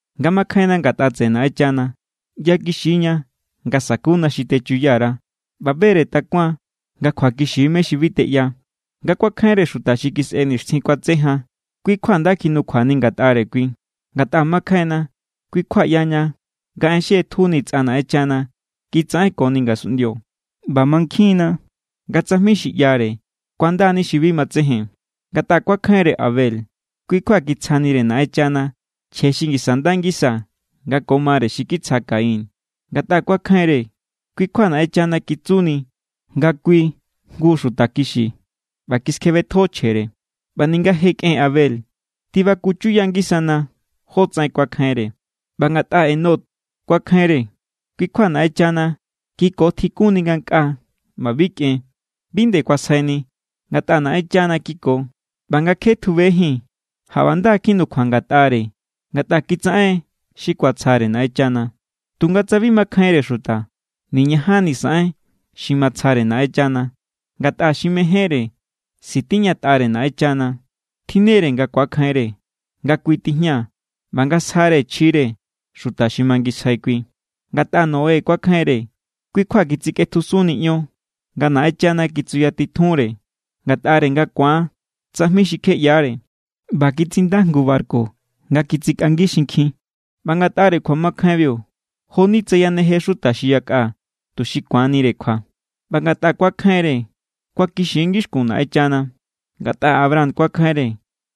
Nga makjainna ngatꞌa tseꞌe Naꞌenchana, ꞌyakixi=ña nga sakuna xi techuya_ra ꞌba be=re takuan nga kjuakixi= mé= xi bi teꞌya. Ngatꞌa kuakjainre xuta xi kisꞌe nixtjin kuatse jan, kui= kjua nda kjinukjuani ngatꞌare kui. Ngatꞌa makjainna, kui kjua ꞌyaña nga en xi ꞌetjuni tsꞌa Naꞌenchana kitsaꞌenkoni ngasunꞌndio ꞌba mankjin=na nga tsajmi xi ꞌyare kuandani xi bi matsejen. Ngatꞌa kuakjainre Abel, kui kjua kitsjanire Naꞌenchana chje xi ngisa nda ngisa nga ko mare xi kitsja Caín. Ngatꞌa kuakjainre, kui= kjua Naꞌenchana kitsuni nga kui jngu xuta kixi ꞌba kiskjebetjo chjere. ꞌBa ninga je kꞌen Abel, tibaku chuya ngisana jótsaꞌen kuakjainre. ꞌBa ngatꞌa Enoc kuakjainre, kui= kjua Naꞌenchana kiko tjikunni ngankꞌaa ꞌba bi kꞌen. Bi nde kuasjaini, ngatꞌa Naꞌenchana kiko. ꞌBa nga kje tjubejín, jaꞌba nda kjinukjua ngatꞌare ngatꞌa kitsaꞌen xi kuatsjare Naꞌenchana. Tunga tsa bi makjainre xuta, niñajanni saꞌen xi matsjare Naꞌenchana. Ngatꞌa xi mejénre sitiñatꞌare Naꞌenchana, tjinnere nga ku̱akjainre nga kui tijña ꞌba nga sjare chjire xuta xi mangisjai kui. Ngatꞌa Noé kuakjainre, kui kjua kitsikꞌetjusunni ion nga Naꞌenchana kitsuyatitjunre ngatꞌare nga ku̱an tsajmi xi kje ꞌyaáre, ꞌba kitsinda jngu barku nga kitsikꞌangi xinkjin. ꞌBa ngatꞌare kjuamakjainbiu, jo=ni tsa yaneje xuta xi yakꞌa tuxi ku̱anire kjua. ꞌBa ngatꞌa kuakjainre, kuakixi= ngixkun Naꞌenchana. Ngatꞌa Abraham kuakjainre,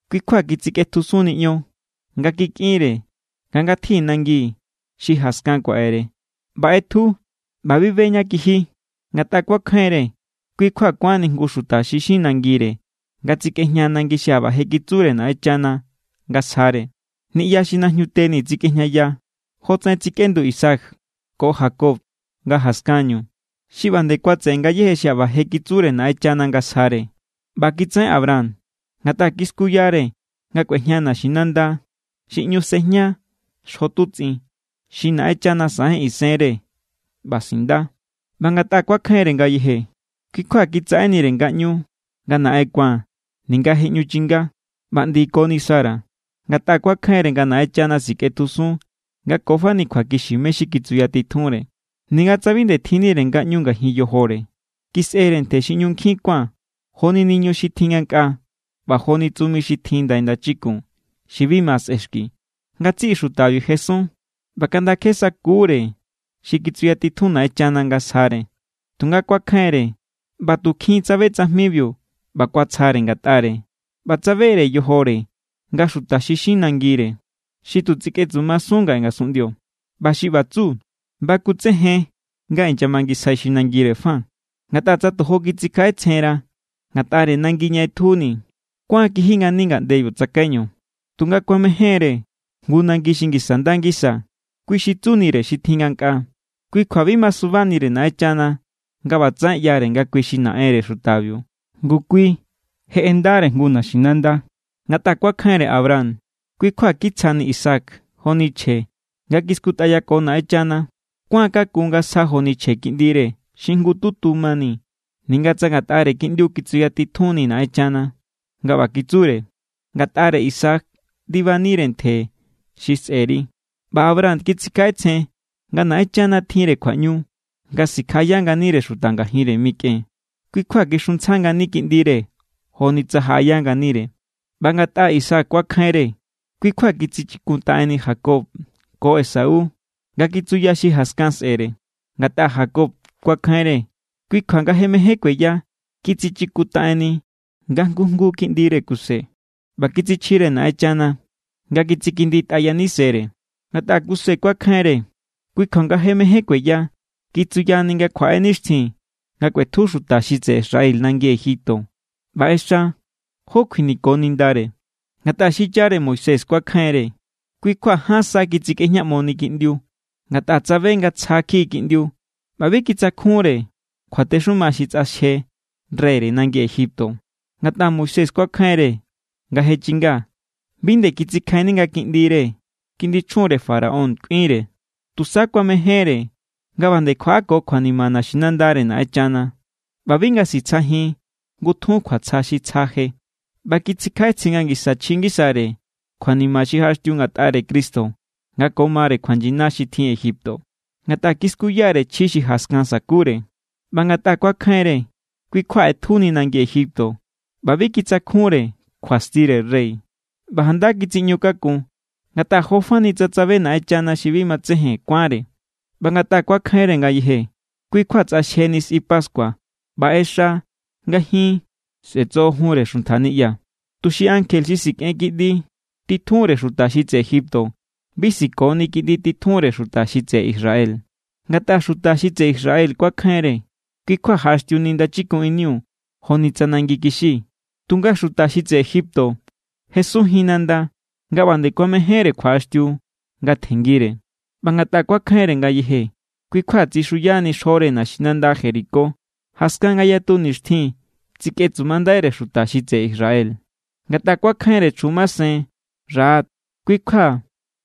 kui= kjua kitsikꞌetjusunni ion nga kikꞌinre nga ngatji nangi xi jaskan kuaꞌere, ꞌba ꞌetju ꞌba bi be ñá ñá kiji. Ngatꞌa kuakjainre, kui= kjua kuánni jngu xuta xi xin nangire nga tsikꞌejña nangi xi jaꞌba je kitsure Naꞌenchana nga sjare. Niꞌya xi najñute ni tsikꞌejñaya, jotsaꞌen tsikꞌendu Isaac ko Jacob nga jaskanñu, xi ꞌba nde kuatseꞌe ngayéje xi jaꞌba je kitsure Naꞌenchana nga sjare. ꞌBa kitsaꞌen Abraham, ngatꞌa kiskuyare nga kꞌuejña naxinanda xi ꞌñu sejña xjo tutsꞌin, xi Naꞌenchana saꞌen isenre ꞌba sinda. ꞌBa ngatꞌa kuakjainre ngayeje, kui= kjua kitsaꞌe nire ngaꞌñu nga naꞌen ku̱an, ninga je ꞌñu chinga ꞌba ꞌndikoni Sara, ngatꞌa kuakjainre nga Naꞌenchana sikꞌetjusun nga ko fani kjuakixi mé= xi kitsuyatitjunre. Ninga tsa bi nde tjinnire ngaꞌñu ngajin yojore, kisꞌere ntje xi ꞌñu nkjin kuán joni niñu xi tjin ngankꞌaa ꞌba joni tsumi xi tjin ndai ndachikun xi bi ma sꞌexki. Ngatsiꞌi xutabiu jesun ꞌba kaꞌnda kje sakuúre xi kitsuyatitjun Naꞌenchana nga sjare. Tunga kuakjainre, ꞌba tu kjin tsabe tsajmibiu ꞌba kuatsjare ngatꞌare, ꞌba tsabere yojore nga xuta xi xin nangire, xi tu tsikꞌetsumasun ngaꞌe ngasunꞌndio. ꞌBa xi ꞌba tsu, bakutsejen nga inyamangisjai xi nangire fa. Ngatꞌa tsa tojo kitsikjaꞌetsjenra ngatꞌare nangi ña ꞌetjuni, kuán= kiji ngani ngaꞌndebiu tsakaiñu. Tunga kuamején=re jngu nangi xi ngisa nda ngisa, kui xi tsunire xi tjin ngankꞌaa. Kui kjua bi masubanire Naꞌenchana nga ꞌbatsaꞌen ꞌyare nga kui xi Naꞌenre xutabiu, ngu kui je ꞌendare jngu naxinanda. Ngatꞌa kuakjainre Abraham, kui= kjua kitsjani Isaac joni chje, nga kiskutꞌayako Naꞌenchana. Kuán kakun nga sja joni chje kiꞌndire xi jngututu mani, ninga tsa ngatꞌare kiꞌndiu kitsuyatitjunni Naꞌenchana nga ꞌba kitsure: “Ngatꞌare Isaac ndibanire ntje xi sꞌe̱ri.” ꞌBa Abraham kitsikjaꞌetsjen nga Naꞌenchana tjinre kjuaꞌñu nga sikjaꞌaya nganire xuta ngajinre mikꞌen, ꞌba kui= kjua kixuntsja ngani kiꞌndire joni tsa jaꞌaya nganire. ꞌBa ngatꞌa Isaac kuakjainre, kui kjua kitsichikuntaꞌenni Jacob ko Esau nga kitsuya xi jaskan sꞌe̱re. Ngatꞌa Jacob kuakjainre, kui kjua nga je mején kueya, kitsichikuntaꞌenni nga jngu jngu kiꞌndire Kuse ꞌba kitsichjire Naꞌenchana nga kitsikinditꞌa yanisere. Ngatꞌa Kuse kuakjainre, kui kjua nga je mején kueya, kitsuyani nga kjuaꞌe nixtjin nga kꞌuetju xuta xi tseꞌe Israel nangi Egipto ꞌba ꞌexa jó kjuiniko nindare. Ngatꞌa xichare Moisés kuakjainre, kui kjua ján sa kitsikꞌejñaꞌmoni kiꞌndiu, ngatꞌa tsabe nga tsja kjiꞌi kiꞌndiu ꞌba bi kitsakjunre kjuatexuma xi tsꞌaxje reyre nangi Egipto. Ngatꞌa Moisés kuakjainre, nga je chinga, bi nde kitsikjainni nga kiꞌndire kiꞌndi chjunre Faraón kꞌuinre. Tusa kuamejénre nga ꞌba nde kjuaꞌako kjuanima naxinandare Naꞌenchana ꞌba bi nga sitsjajin ngutjun kjuatsja xi tsja je. ꞌBa kitsikjaꞌetsjen nga ngisa chji ngisare kjuanima xi jaꞌaxtiu ngatꞌare Cristo nga ko mare kjuanyina xi tjin Egipto, ngatꞌa kiskuya=re chji xi jaskan sa̱kure. ꞌBa ngatꞌa kuakjainre, kui= kjua ꞌetjuni nangi Egipto ꞌba bi kitsakjunre kjuastire rey. ꞌBa janda kitsiꞌñu kakun, ngatꞌa jo fani tsa tsabe Naꞌenchana xi bi matsejen kuánre. ꞌBa ngatꞌa kuakjainre ngayeje, kui= kjua tsꞌaxjeni sꞌi pascua ꞌba ꞌexa nga jin sꞌe̱tsojojunre xuntja niꞌya, tuxi ankje xi sikꞌen kiꞌndi titjunre xuta xi tseꞌe Egipto bi sikoni kiꞌndi titjunre xuta xi tseꞌe Israel. Ngatꞌa xuta xi tseꞌe Israel kuakjainre, kui= kjua jaꞌaxtiuni Ndachikun iniu joni tsa nangi kixi. Tunga xuta xi tseꞌe Egipto jesunjin nanda nga ꞌba nde kuamejénre kjuaꞌaxtiu nga tjenngire. ꞌBa ngatꞌa kuakjainre ngayeje, kui= kjua tsixuyani xjore naxinanda Jericó, jaskan nga yatu nixtjin tsikꞌetsumandaire xuta xi tseꞌe Israel. Ngatꞌa kuakjainre chjun masen Rahab, kui= kjua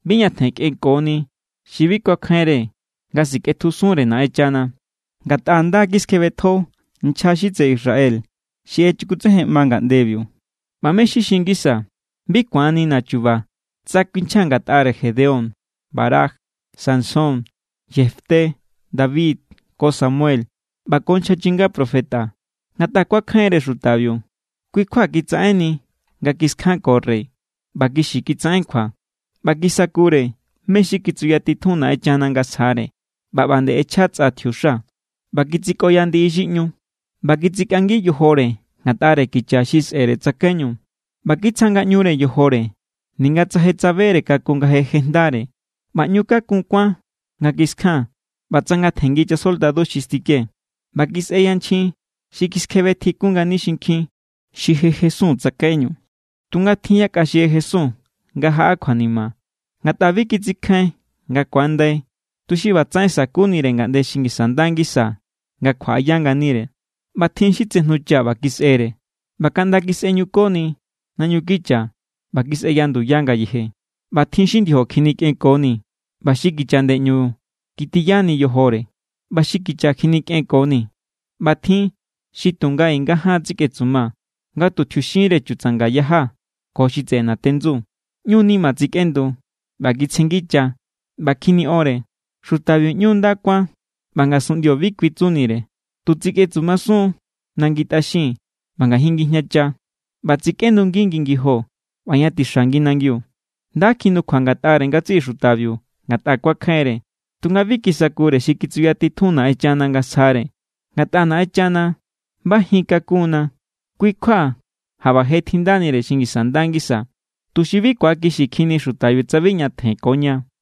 bi ñatjen kꞌenkoni xi bi kuakjainre nga sikꞌetjusunre Naꞌenchana, ngatꞌa nda kiskjebetjo nchja xi tseꞌe Israel xi echukutsejenꞌma ngaꞌndebiu. ꞌBa ¿mé= xi xin ngisaa̱? Bi ku̱annina̱ chuba tsa kuinchjaa̱ ngatꞌare Gedeón, Barac, Sansón, Jefté, David ko Samuel ꞌba ko nchja chinga profeta. Ngatꞌa kuakjainre xutabiu, kui= kjua kitsaꞌenni nga kiskjanko rey, ꞌba kixi kitsaꞌen kjua, ꞌba kisakure mé= xi kitsuyatitjun Naꞌenchana nga sjare. ꞌBa ꞌba nde ꞌechja tsꞌa tjiuxa, ꞌba kitsikꞌoya ndiꞌi xi ꞌñu, ꞌba kitsikꞌangi yojore ngatꞌare kicha xi sꞌere tsakaiñu, ꞌba kitsja ngaꞌñure yojore ninga tsa je tsabere kakun nga je jejndare, ꞌba ꞌñu kakun kuán nga kiskjan, ꞌba tsangatjenngi chasoldadu xi stike. ꞌBa kisꞌe yanchjin xi kiskjebe tjikun ngani xinkjin xi je jesun tsakaiñu. Tunga tjin yakꞌa xi jesun nga jaꞌa kjuanima, ngatꞌa bi kitsikjain nga ku̱andai̱, tuxi ꞌbatsaꞌen sa̱kunire ngaꞌnde xi ngisa nda ngisa nga kjuaꞌaya nganire. ꞌBa tjin xi tsejñucha ꞌba kisꞌere, ꞌba kaꞌnda kisꞌeꞌñukoni naꞌñu kicha ꞌba kisꞌeya nduya ngayeje. ꞌBa tjin xi ndiojo kjinikꞌenkoni, ꞌba xi kicha ꞌndeꞌñu kitiyani yojore, ꞌba xi kicha kjinikꞌenkoni. ꞌBa tjin xi tu nga i nga jaan tsikꞌetsuma nga tu tjiuxinre chutsanga= yaja ko xi tseꞌe natendsu. ꞌÑu nima tsikꞌendu, ꞌba kitsjenngicha, ꞌba kjiniꞌonre. Xutabiu ꞌñu nda kuán ꞌba ngasunꞌndio bi kui tsunire. Tu tsikꞌetsumasun= nangi tꞌaxin ꞌba ngajin ngijñacha, ꞌba tsikꞌendungi ngi ngijo ꞌba ña tixa ngi nangiu. Nda kjinukjua ngatꞌare ngatsiꞌi xutabiu ngatꞌa kuakjainre, tunga bi kisakure xi kitsuyatitjun Naꞌenchana nga sjare. Ngatꞌa Naꞌenchana bajin kakun=na, kui= kjua jaꞌba je tjindanire xi ngisa nda ngisa, tuxi bi ku̱akixikjinni xutabiu tsa bi ñatjen ko ña.